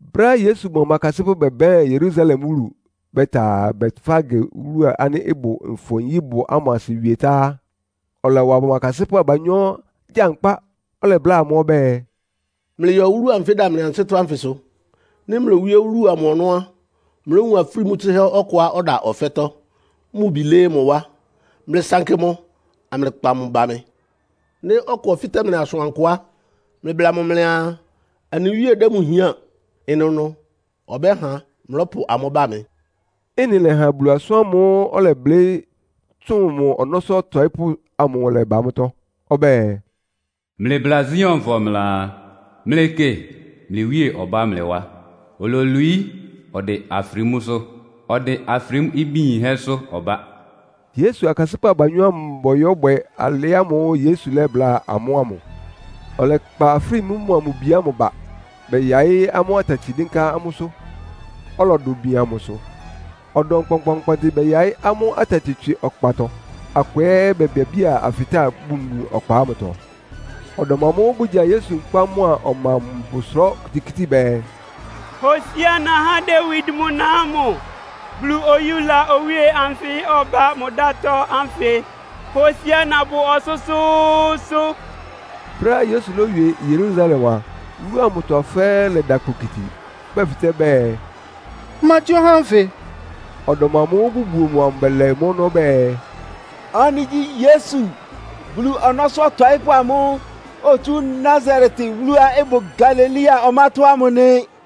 Brɛ́á Yesu mʋa mʋ akasɩ́pʋ́ bɛbɛ́ɛn Yerusalem wúlu, bɛta Betfage wúlu ánɩ́ ɩbʋ Nfɔ-nyíbʋ ámʋ asɩ wie tá á, ɔlɔwa mʋ akasɩ́pʋ́ abanyɔ́ gyankpá. Ɔlɛbláa amʋ́ ɔbɛ́ɛ, “Mlɩyɔ wúlu anfɩ́ ɩda mlɩ ansɩ́tɔ́ ánfɩsʋ. Nɩ́ mlowíé wúlu amʋ ɔnɔ́ á, mlówun afrímú tsɩ́hɛ́ ɔkʋá ɔda ɔfɛ́tɔ́, mʋ bi lɩ́ɩ́ mʋ wá. Mlɩsankɩ mʋ, amlɩkpa amʋ́ ba mɩ. Nɩ́ ɔkʋ ɔfɩ́tɛ́ mlɩ asʋankʋ á, mlɩbla mʋ mlɩaa, ‘Anɩ Wíe dɛ́ amʋ́ hián.’ Ɩnʋnʋ ɔbɛ́ha mlɔ́pʋ amʋ́ ba mɩ.” Ɩ́nɩ lɛ́ha Bulu asʋ́n ámʋ́ʋ́ ɔlɛblɩ́ tsʋn mʋ ɔnɔ́sʋ́ ɔtɔɩ́pʋ́sʋ ámʋ lɛ́ba mʋ́tɔ́. Ɔbɛ́ɛ, “Mlɩbla Sionfɔ mlɩaa, Mlɩkɩ, mlɩ Wíe ɔbá mlɩ wá. Ololwií, ɔdɩn afrímúsʋ́. Ɔdɩn afrímú ibí yínhɛ́sʋ́ ɔbá.” Yesu akasɩ́pʋ́ abanyɔ́ ámʋ bɔyɔ́bwɛ alɩ ámʋ́ʋ́ Yesu lɛ́bláa amʋ́ ámʋ. Bɛkpa afrímú mʋa mʋ bi ámʋ ba, bɛyaɩ́ amʋ́ atati dɩ́nká amʋ́sʋ́, ɔlɔdʋ bian mʋsʋ. Ɔdɔm kpɔnkpɔɔnkpɔntɩ bɛyaɩ́ amʋ́ atati tswɩ ɔkpatɔ, akʋ ɛ́ bebiabía afɩtáa bunbun ɔkpa ámʋtɔ. Ɔdɔm amʋ́ʋ́ bʋgya Yesu nkpá mʋ́a ɔma amʋ bɔsʋrá okitikíti bɛɛ, “Hosiána há Dawid mʋ na ámʋ! Bulu oyúla owíe anfɩ ɔbá mʋ dátɔ́ ánfɩ! Hosiána bʋ ɔsʋ́sʋ́ʋ́sʋ́!” Brɛ́á Yesu lówie Yerusalem a, wúlu amʋtɔ fɛ́ɛ́ lɛda kpokiti, bʋdɛfɩtɛ́ bɛɛ, “Ma gyí ɔhá ánfɩ?” Ɔdɔm amʋ́ʋ́ bʋbuo mʋ amʋ bɛlɛ mʋ́ ɔnɔ́ bɛɛ, “Ɔ́nɩ gyí Yesu, Bulu ɔnɔ́sʋ́ ɔtɔɩ́pʋ́ amʋ́ʋ́ otsú Nasaret wúluá ɩbʋ Galilea ɔmátɔ́ ámʋ nɩ.”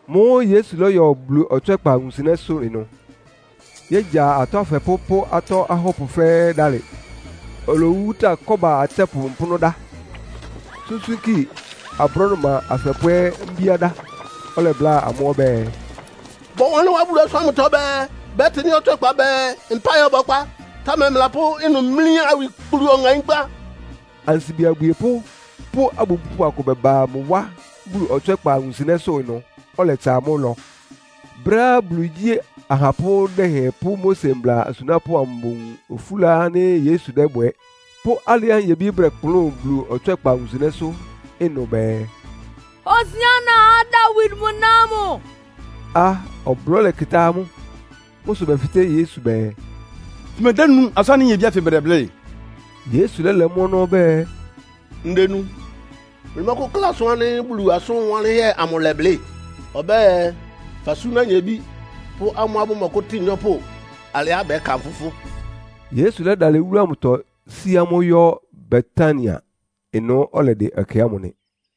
Mʋ́ʋ́ Yesu lɔ́yɔ Bulu ɔtswɛ́kpa wunsɩnɛ́sʋ́ ɩnʋ, yégya atɔ́ afɛpʋ́ pʋ́ atɔ́ ahɔ́pʋ fɛ́ɛ́ dalɩ. Olowuwúta kɔ́ba atsɛ́pʋ mpʋ́nʋ́ dá, súnsúnki abrɔ́dʋma afɛpʋ́ ɛ́ mbíá dá. Ɔlɛbláa amʋ́ ɔbɛ́ɛ, “Bɔwanlɩ́n wá Bulu asʋ́n ámʋtɔ bɛɛ, ‘Bɛ́tɩ mɩ́ ɔtswɛ́kpa bɛɛ, mpáɩ ɔbɔkpá.’ Támɛ mlɩlapʋ́ ɩnʋ mlí awikplu ɔŋaínkpá.” Ansibi abwiepʋ́ pʋ́ abubúpʋ akʋ bɛba mʋ wá Bulu ɔtswɛ́kpa wunsɩnɛ́sʋ́ ɩnʋ, ɔlɛtsa amʋ́ ɩlɔ. Brɛ́á Bulu igyí ahapʋ́ dɛhɛn pʋ́ Mose mbla asunápʋ́ amʋ bowun ofúla ánɩ́ Yesu dɛ́bwɛ, pʋ́ alɩá nyebí bʋdɛkplʋ́n Bulu ɔtswɛ́kpa wunsɩnɛ́sʋ́ ɩnʋ bɛɛ, “Hosiána há Dawid mʋ na ámʋ!” a, ɔblɔ́ lɛkɩtá amʋ́. Mʋ́ sʋ bɛfɩtɛ́ Yesu bɛɛ, “Fʋmedénu asʋ́n ánɩ́ nyebí ánfɩ bʋdɛblɩ́?” Yesu lɛ́lɛ mʋ́ ɔnɔ́ ɔbɛ́ɛ, “Ndenu. Mlɩmɔ́kʋ́kla asʋ́n ánɩ́ Bulu asʋ́n wanlɩ́nhɛ́ amʋ lɛ́blɩ́? Ɔbɛ́ɛ, ‘Fasúná nyebí pʋ́ amʋ́á bʋmɔkʋ́tɩn nyɔ́pʋ alɩá bʋkánfʋ fʋ́.’” Yesu lɛ́dalɩ wúlu amʋtɔ sí amʋ́ yɔ́ Betania. Ɩnʋ́ ɔlɛdɩ ɛkɛ ámʋ nɩ.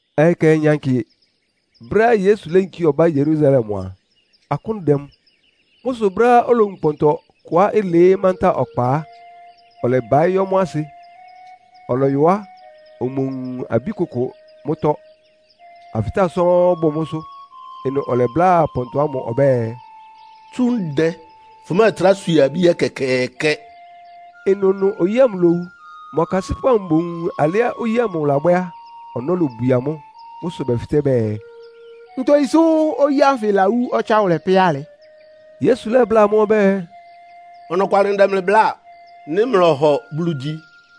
Ɔyɩ kɛhɛ nyankɩ, brɛ́á Yesu léyinkí ɔbá Yerusalem a, akʋ́n dɛ mʋ. Mʋ́ sʋ brɛ́á olowun pɔntɔ kʋá ɩlɩɩ́ mantáa ɔkpa á, ɔlɛbaɩ́ yɔ́ mʋ́ asɩ. Ɔlɔyɔ á, omowun abí kʋkʋ mʋ́tɔ́, afɩtáa sɔ́ɔ́n bʋ mʋ́sʋ́. Ɩnʋ ɔlɛbláa pɔntɔ ámʋ ɔbɛ́ɛ, “Tsú ndɛ fʋmɛ́ɛtrá swie abí ɛkɛkɛɛkɛ!” Ɩnʋnʋ oyí ámʋ lówu. Mʋ akasɩ́pʋ́ amʋ bowun alɩá oyí ámʋ labwɛ́ á, ɔnɔ́ lobwie amʋ́. Mʋ́ sʋ bɛfɩtɛ́ bɛɛ “Ntogyi sʋ́ oyí ánfɩ lawú ɔtsáwʋlɛ pɛ́ alɩ?” Yesu lɛ́bláa amʋ́ ɔbɛ́ɛ, “Ɔnɔkwalɩ ndɛ mlɩ bláa. Nɩ́ mlɔhɔ Bulu gyi,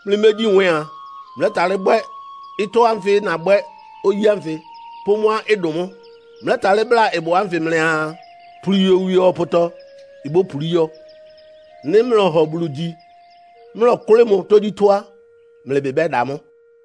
mlɩmégyi nwɛ́ɛn a, mlɛ́talɩ́ bwɛ́ ɩtɔ́ ánfɩ nabwɛ́ oyí ánfɩ pʋ́ mʋ́á ɩdʋn mʋ́. Mlɛ́talɩ́ bláa ɩbʋ ánfɩ mlɩaa, ‘Puli yowie ɔpʋtɔ.’ Ibópulí yɔ́. Nɩ́ mlɔhɔ Bulu gyi, mlɔkʋ́lɩ́ mʋ tógyítɔ́ á, mlɩ ɩbɩ bɛ́da mʋ́.”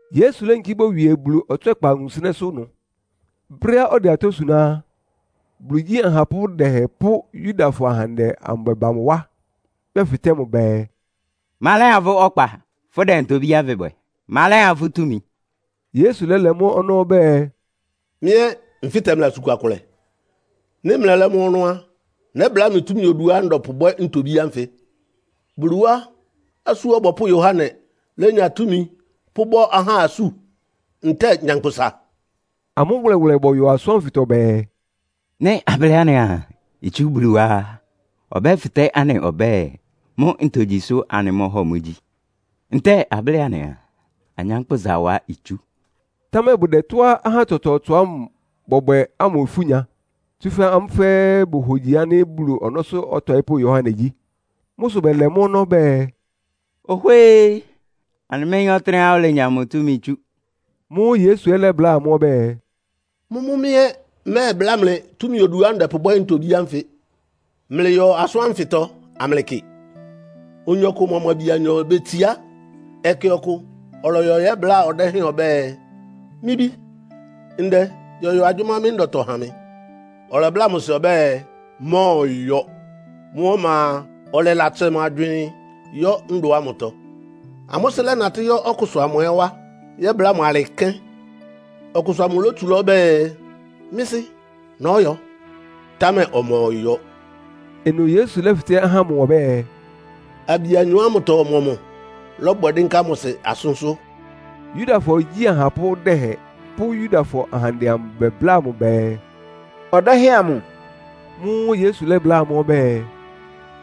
Yesu léyinkí bowie Bulu ɔtswɛ́kpa wunsɩnɛ́sʋ́ ɩnʋ. Brɛ́á ɔdɛ atɔ́ suná á, Bulu igyi ahapʋ́ dɛhɛn pʋ́ Yudafɔ ahandɛ amʋ bɛba mʋ wá. Bɛfɩtɛ́ mʋ bɛɛ, “Ma lɛ́ha fʋ́ ɔkpa, fʋ́dɛ ntobí ánfɩ bwɛ? Ma lɛ́ha fʋ́ túmi?” Yesu lɛ́lɛ mʋ́ ɔnɔ́ ɔbɛ́ɛ, “Mɩ́ ɛ́ nfɩ́tɛ mlɩ asʋn kua kʋlɛ. Nɩ́ mlɛlɛ́ mʋ́ ɔnɔ́ á, nɛ́bláa mlɩ túmi oduá ndɛpʋbwɛ́ ntobí ánfɩ. Bulu wá Asú Ɔbɔpʋ́ Yohane lénya túmi pʋ́bɔ́ ahá asú, ntɛ́ɛ nyankpʋsa?” Amʋ́ wʋlɛwʋlɛ bɔyɔ asʋ́n ánfɩtɔ bɛɛ, “Nɩ́ ablɩ́ anɩaa itsú Bulu wá á, ɔbɛ́fɩtɛ́ anɩ ɔbɛ́ɛ, mʋ́ ntogyi sʋ́ anɩmɔ́hɔ mʋ gyi? Ntɛ́ɛ ablɩ́ɩ anɩaa, anyánkpʋ́sa wá itsú.” Támɛ bʋdɛ tɔ́á ahá tsɔtsɔɔtsɔ ámʋ bɔ́bwɛ amʋ́ ifú nya. Tsúfɛ́ amʋ́ fɛ́ɛ́ bohogyi ánɩ́ Bulu ɔnɔ́sʋ́ ɔtɔɩ́pʋ́ Yohane gyí. Mʋ́ sʋ bɛlɛ mʋ́ ɔnɔ́ bɛɛ, “Ohwée! Anɩméyín ɔtɩ́nɛ́á olenya mʋ túmi tsú.” Mʋ́ʋ́ Yesu ɛ́ lɛ́bláa amʋ́ ɔbɛ́ɛ, “Mʋ́mʋ́ mɩ́ ɛ́ mmɛ́ɛbláa mlɩ túmi oduá ndɛpʋbwɛ́ ntobí ánfɩ.” “Mlɩyɔ asʋ́n ánfɩtɔ amlɩkɩ. Oyin ɔkʋ mʋa mʋ abi anyɔ betsiá. Ɛkɛ ɔkʋ ɔlɔyɔ yɛ́bláa ɔdɛ́hɛn ɔbɛ́ɛ, ‘Mɩ́ bí, ndɛ yɔyɔ agyʋ́má mɩ́ ndɔtɔ ha mɩ.’ Ɔlɛbláa mʋ sɩ ɔbɛ́ɛ, ‘Mmɔ́ɔyɔ.’ Mʋ́ ɔma a, ɔlɛlatsɛ mʋ agywɩɩn, yɔ́ ndɔ ámʋtɔ. Amʋ́ sɩ́ lɛ́natɩ́ yɔ́ ɔkʋsʋ amʋ ɛ́ wá yɛ́bláa mʋ alɩ kɛ́n. Ɔkʋsʋ amʋ lótsulá ɔbɛ́ɛ, ‘Mɩ́ sɩ́, nɔ́yɔ.’ Támɛ ɔmɔyɔ.” Ɩnʋ Yesu lɛ́fɩtɛ́ ahá ámʋ ɔbɛ́ɛ, “Abi anyɔ ámʋtɔ ɔmɔmʋ lɔ́bwɛ dɩ́nká mʋ sɩ asʋ́nsʋ́?” Yudafɔ igyí ahapʋ́ dɛhɛn pʋ́ Yudafɔ ahandɛ amʋ bɛbláa mʋ bɛɛ, “Ɔdɛ́hɛn amʋ.” Mʋ́ʋ́ Yesu lɛ́bláa amʋ́ ɔbɛ́ɛ,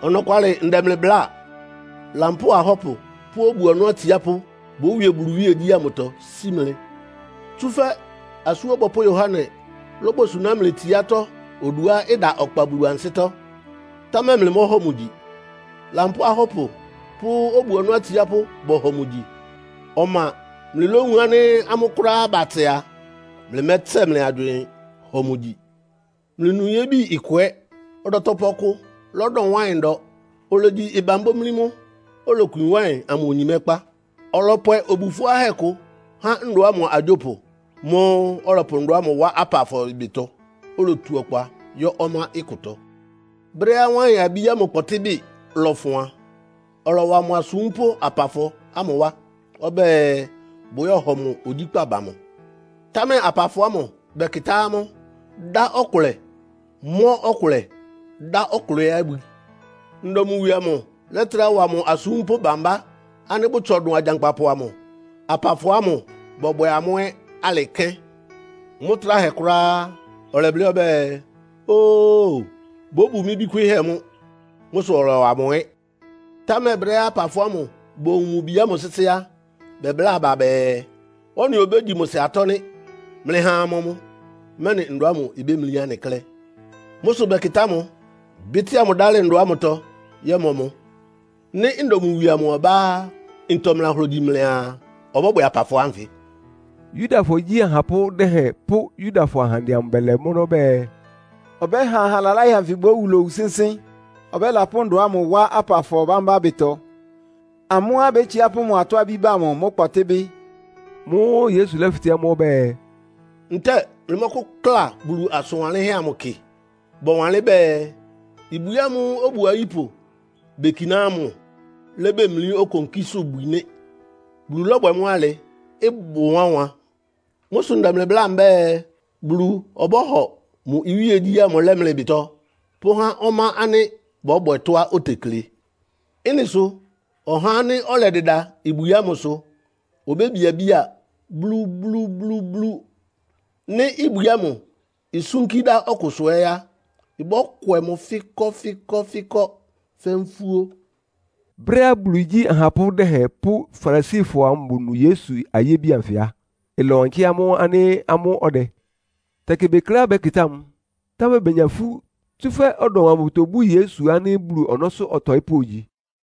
“Ɔnɔkwalɩ ndɛ mlɩ bláa. Lampóo ahɔ́pʋ pʋ́ obu-ɔnɔ́ atsiápʋ́ bówie Bulu iwíegyí ámʋtɔ sí mlɩ. Tsúfɛ́ Asú Ɔbɔpʋ́ Yohane lóbosuná mlɩ tsiátɔ́ oduá ɩda ɔkpa Bulu ansɩ́tɔ́, támɛ mlɩmɔ́hɔ mʋ gyi. Lampóo ahɔ́pʋ pʋ́ obu-ɔnɔ́ atsiápʋ́ bɔhɔ mʋ gyi. Ɔma mlɩlówun ánɩ́ amʋ́ kʋ́ráá batsɛ a, mlɩmɛ́tsɛ mlɩ agywɩɩn hɔ mʋ gyi. “Mlɩnu yébi ɩkʋ ɛ́. Ɔdɔtɔpʋ ɔkʋ lɔ́dɔ wáɩn ndɔ. Olegyi ɩban bómlí mʋ́. Olokwi wáɩn amʋ onyimɛ́kpá. Ɔlɔpwɛ obu fʋ́áhɛ́ kʋ há ndɔ ámʋ agyópʋ. Mʋ́ʋ́ ɔlɔpʋ ndɔ ámʋ wá apafɔ ɩbɩtɔ, olotu ɔkpa yɔ́ ɔmá ɩkʋtɔ. Brɛ́á wáɩn-abí amʋ kpɔtɩ́bɩ lɔ́fʋn a, ɔlɔwa mʋ asúmpʋ́ apafɔ ámʋ wá ɔbɛ́ɛ, bʋyɔ́hɔ mʋ ogyíkpá ba mʋ. Támɛ apafɔ ámʋ bɛkɩtá amʋ́, dá ɔkʋlɛ, mɔ́ ɔkʋlɛ, dá ɔkʋlɛ ɛ́ abwi. Ndɔ mʋ wie amʋ lɛ́trá wa mʋ asúmpʋ́ bámbá ánɩ́ bʋtsɔ dʋn agyankpapʋ amʋ. Apafɔ ámʋ bɔbwɛ amʋ́ ɛ́ alɩ kɛ́n. Mʋ́ tráhɛ kʋ́ráá á, ɔlɛblɩ́ ɔbɛ́ɛ, ‘Oo, bóbu mɩ́ bí kwɩ́ɩ́hɛ́ mʋ́.’ Mʋ́ sʋ ɔlɔwa mʋ ɛ́. Támɛ brɛ́á apafɔ ámʋ bowun mʋ bi ámʋ sɩ́sɩ́ á, bɛbláa aba bɛɛ, ‘Ɔ́nɩ obégyi mʋ sɩ atɔ́ nɩ́. Mlɩha amɔ mʋ, mɛ́nɩ ndɔ ámʋ ibémlí anɩ klɛ́.’ Mʋ́ sʋ bɛkɩtá mʋ, bɩ́tɩ́a mʋ dálɩ ndɔ ámʋtɔ yɔ́mɔ mʋ.” “Nɩ́ ndɔ mʋ wie ɔbá á, ntɔ mlɩlahogyi mlɩaa, ɔbɔ́bwɛ apafɔ ánfɩ?” Yudafɔ igyi ahapʋ́ dɛhɛn pʋ́ Yudafɔ ahandɛ amʋ bɛlɛ mʋ́ ɔnɔ́ bɛɛ, “Ɔbɛ́ha aha laláhɛ anfɩ bówu lowu sɩ́nsɩ́n, ɔbɛ́lapʋ́ ndɔ ámʋ wá apafɔ bámbá ɩbɩtɔ. Amʋ́á bétsiá pʋ́ mʋ atɔ́-abí ba mʋ mʋ́ kpɔtɩ́bɩ.” Mʋ́ʋ́ Yesu lɛ́fɩtɛ́ amʋ́ ɔbɛ́ɛ, “Ntɛ́ɛ mlɩmɔ́kʋ́kla Bulu asʋn wanlɩ́nhɛ́ amʋ kɩ? Bɔwanlɩ́n bɛɛ, ‘Ibwi ámʋ́ʋ́ obu ayípʋ bekiná ámʋ lébemlí okonkísʋ́bwi nɩ́. Bulu lɔ́bwɛ mʋ́ alɩ. Ɩbʋ wánwan.’ “Mʋ́ sʋ ndɛ mlɩ bláa mbɛ́ɛ, Bulu ɔbɔ́hɔ mʋ iwíegyí ámʋ lɛ́ mlɩ ɩbɩtɔ pʋ́há ɔmá ánɩ́ bɔbwɛ tɔ́á otekle. “Ɩ́nɩ sʋ ɔhá ánɩ́ ɔlɛdɩda ibwi ámʋsʋ obébiabía blúblúblúblú. Nɩ́ ibwi ámʋ isúnkí dá ɔkʋsʋ ɛ́ á, ɩbɔ́kwɛ mʋ fɩ́kɔ́fɩ́kɔ́fɩ́kɔ́ fɛ́ nfúó.” Brɛ́á Bulu igyi ahapʋ́ dɛhɛn pʋ́ Farisifɔ ámʋ bonu Yesu ayébi anfɩ á, ɩlɔwankɩ́ amʋ́ ánɩ́ amʋ́ ɔdɛ. Tɛkɩ bekleá bɛ́kɩtá mʋ, támɛ benya ifú, tsúfɛ́ ɔdɔm amʋ bʋtobú Yesu ánɩ́ Bulu ɔnɔ́sʋ́ ɔtɔɩ́pʋ́ ogyi.